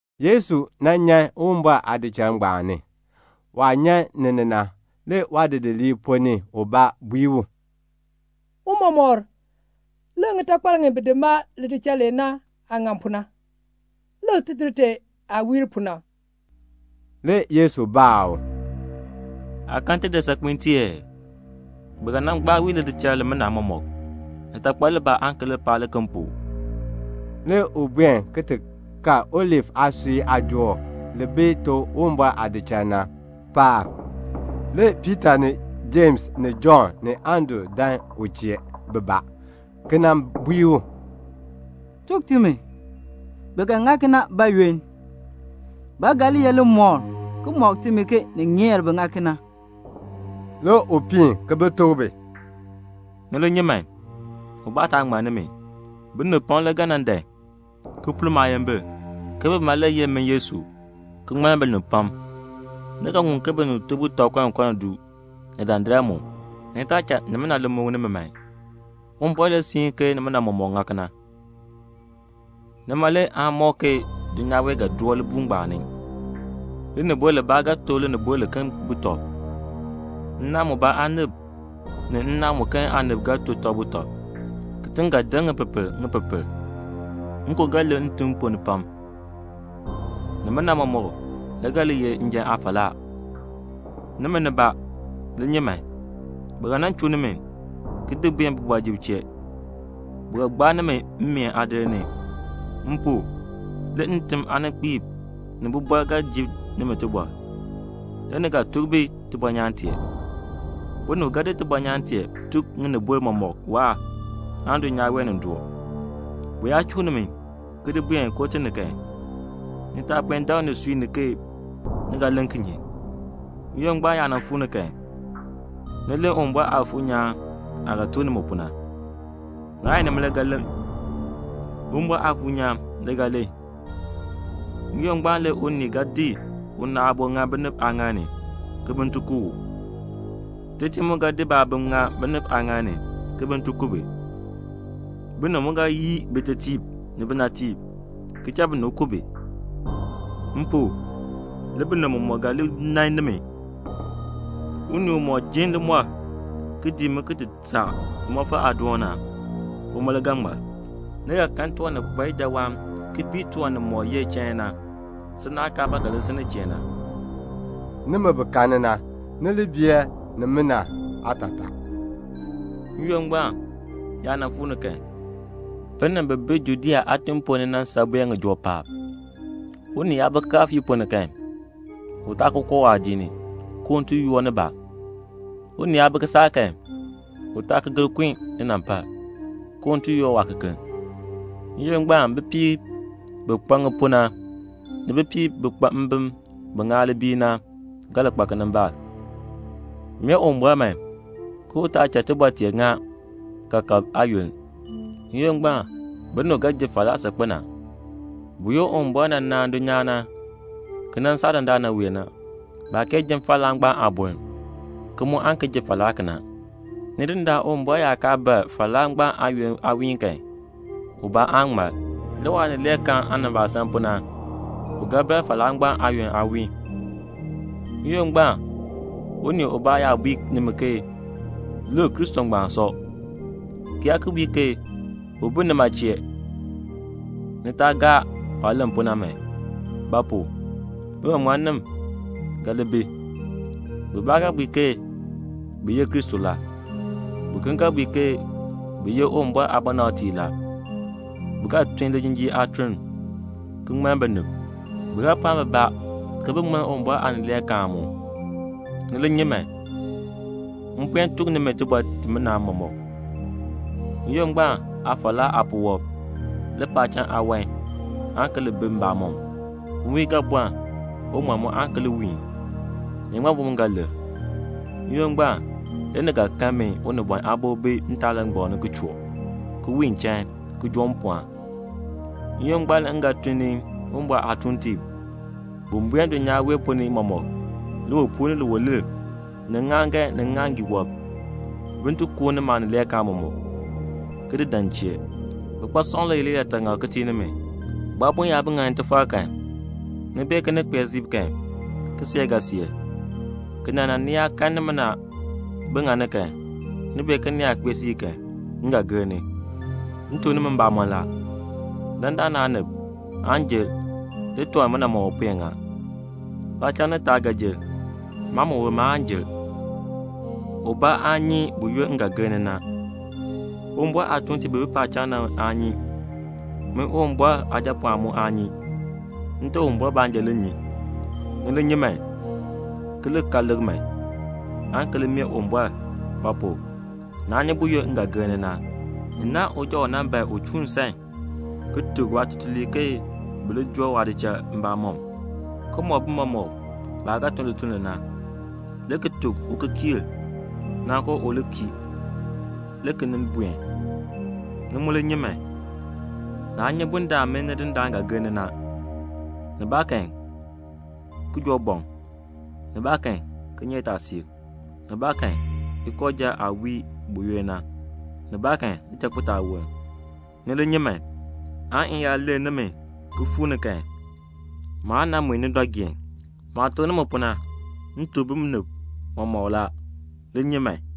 Le Yesu nyan Uwumbɔr aadichal ngbaan ni. Waah nyan ni na le waadidiliib ponn ni ubaa bui u, "Tiicha, lik ŋitakpal ŋi bi di maa lidichal lee na aah ŋan pu na, tidir tee aah wiir pu na." Le Yesu baa u, "Aa kan tidir saakpiin tee la aa? Bi ga nan gbaa wii lidichal limina mɔmɔk. Litakpal libaa aan ki li paa liken pu." Le u buen ki ti kal Olif aasui aajool paab, li si gbak Uwumbɔr aadichal chee na. Le Piita ni Jems ni Jɔnn ni Andru dan u chee bibaa, ki nan bui u, "Tuk timi, bi ga ŋa kena bayoonn? Ba ga li ye limɔkl ki mɔk timi ke ni ŋeer bin ŋa kena?" Le u piin ki bi tuk bi, "Ni li nyi man, ubaa taa ŋmann nimi. Binib pam le ga nan dan, ki pur maayimbil, ke bima le ye min Yesu, ki ŋmann binib pam. Ni ga ŋun ke binib to butɔb kɔnkɔni du, ni dandar mu. Ni taa cha ni li muk nimi man. Uwumbɔr le siin ke nimina mɔmɔk ga ŋa. Nima le aan mɔk ke dulnyaa wee ga doo libuul ngbaan ni. Linibol libaa ga to linibol liken butɔb. Nnaan mubaa aanib ni nnaan muken aanib ga to tɔb butɔb. Kitiŋ ga deŋ ŋipepel, ŋipepel. Nkon le ga lir ntim pam ponn ni. Nimina mɔmɔk le ga li ye njan aafalaa. "Nimi, ni li nyi man. Bi ga nan chuu nimi, ki di buen kooti mam ni. Bi ga gbaa nimi mmeen aadir ni. M pu, le ntim aaninkpiib ni bibɔrb ga ji nimi tibɔr. Le ni ga tuk bi tibɔnyaan tee. Binib ga di tibɔnyaan tee ki tuk ŋinibol mɔmɔk waahr, aan dulnyaa wee nin doo. Bi yaa chuu nimi, ki di buen kooti ni kan, ni taa puen dak nisui ni ke ni ga len kinye. N-yoonn ngbaan yaa nan fuu ni kan, lem Uwumbɔr Aafuur nyaan aah ga tuk nimi pu na. Naa ye nimi le ga len. Uwumbɔr Aafuur nyaan le ga len. N-yoonn ngbaan le unii ga di una aabo ki di ŋa binib aaŋaal ni, ke bin ti ku u. Tetiib mu ga di baabim, ki di ŋa binib aaŋaal ni, ke bin ti ku bi. Binib mu ga yii bitetiib ni binatiib, ki cha binib ku bi. M pu, le binib mɔmɔk ga li nan nimi. Unii umɔk ji limɔr ki dii mi ki ti saa limɔfal aadoon na, uma le ga ŋmar." "Ni ga kan tiwan ni kpa ijawaan ki bii tiwan nimɔk ye chain na, si naah kaa ba ga li si nin chee na." (Nimi bi karni na, ni li bee nimina aatataa.) "N-yoonn ngbaan yaa nan fuu ni kan, binib bi bi Judea aatiŋ ponn ni na, bin san buen ŋijoo paab. Unii yaa bi kikaafiik ponn ni kan, u taa ki koo waadiik ni, ke un ti yoor nibaa. Unii yaa bi kisaak kan, u taa ki gir kun linampal, ke un ti yoor waakekeln. N-yoonn ngbaan bipiib bi kpa ŋipuu na, ni bipiib bi kpa mbim bi ŋaa libiil na, bi ga li kpa kinimbaak. Mee Uwumbɔr man, ke u taa cha tibɔr tee ŋa kaakab aayoonn. N-yoonn ngbaan binib ga ji falaa saakpen a. Buyoonn Uwumbɔr nan naan dulnyaa na, ki nan saa dandana wee, baa kee ji falaa ngbaan aaboln, ki mu aan ki ji falaa kena. Nidindaan Uwumbɔr yaa kaa bar falaa ngbaan aayoonn aawiin kan, ubaa aan ŋmar. Le waanileekaan aanimbaasaln pu na, u ga bar falaa ngbaan aayoonn aawiin. "N-yoonn ngbaan unii ubaa yaa bui nimi ke, 'Lik, Kristo ngbaan sɔ,' ki yaa ki bui ke 'U bi nima chee', ni taa gaa waah len pu na man. Ba pu? biŋmaŋmannim ga li bi. Bibaa ga bui ke bi ye Kristo la. Biken ga bui ke bi ye Uwumbɔr aabɔnabtiib la. Bi ga tun lijinjiir aatun ki ŋmann binib; bi ga pɔɔn bibaa ke bin ti ŋmann Uwumbɔr aanileekaan mu. Ni li nyi man. M puen tuk nimi tibɔr timina mɔmɔk." "N-yoonn ngbaan aafalaa aapuwɔb, le paacham aawan aan ki li bi mbamɔm. Nwiin le ga bɔln. Uŋmal mu aan ki li wiin. Iŋmabi mu ga lir. N-yoonn ngbaan le ni ga kan min Unibɔn Aabo bi ntaalangbam ni ki choo, ki wiin chain, ki joo mpɔɔn. N-yoonn ngbaan le m ga tun ni Uwumbɔr aatuuntiib bin buen dulnyaa wee ponn ni mɔmɔk, liwipuul ni liwilir ni ŋŋaaŋgan ni ŋŋaaŋgii wɔb, bin ti kuuni maanileekaan mɔmɔk, ki di dan m chee." "Bikpasɔm le ye liyaataŋakl ki tii nimi. Bu aabon yaa bi ŋani tifar kan, ni bee ke ni kpee siib na kan, kiseek ga seer. Kena na, ni yaa kan nimina bi ŋani kan, ni bee ke ni kpee siib na kan, m ga gir ni. M tuk nimi mbamɔn la, dandana aanib aan jer le tiwan nimina mɔmɔk puen ŋa. Paacham ni taab ga jer. Maaliin ma aan jer." "Ubaa aa nyi buyoonn m ga gir ni na. Uwumbɔr aatuuntiib bi bi paacham na, aa nyi. Min Uwumbɔr Aajapɔɔn mu aa nyi. Nte Uwumbɔr baanja le nyi. Ni li nyi man, ki li ka lik man, aan ki li mee Uwumbɔr; ba pu? naa nyi buyoonn m ga gir ni na. Ni naahn uja u nan ban un chuun nsan, ki tuk waatutuliib ke bi li joo waadichal mbamɔm, ki mɔk bi mɔmɔk baah ga tun lituln li na, le ki tuk ukikiir na ke u li kii, le ki nin buen. Ni mu li nyi man. Naa nyi bundaln min Nidindaan ga gir ni na, nibaakan kijoobɔŋ, nibaakan kinyeetaasiik, nibaakan ikooja aah wii buyoonn na, nibaakan lichakpitaawoln. Ni li nyi man, aan m yaa lur nimi ki fuu ni kan, maan nan mui ni dɔ geen. Maah tuk nimi pu na, m tuk binib mɔmɔk la, li nyi man."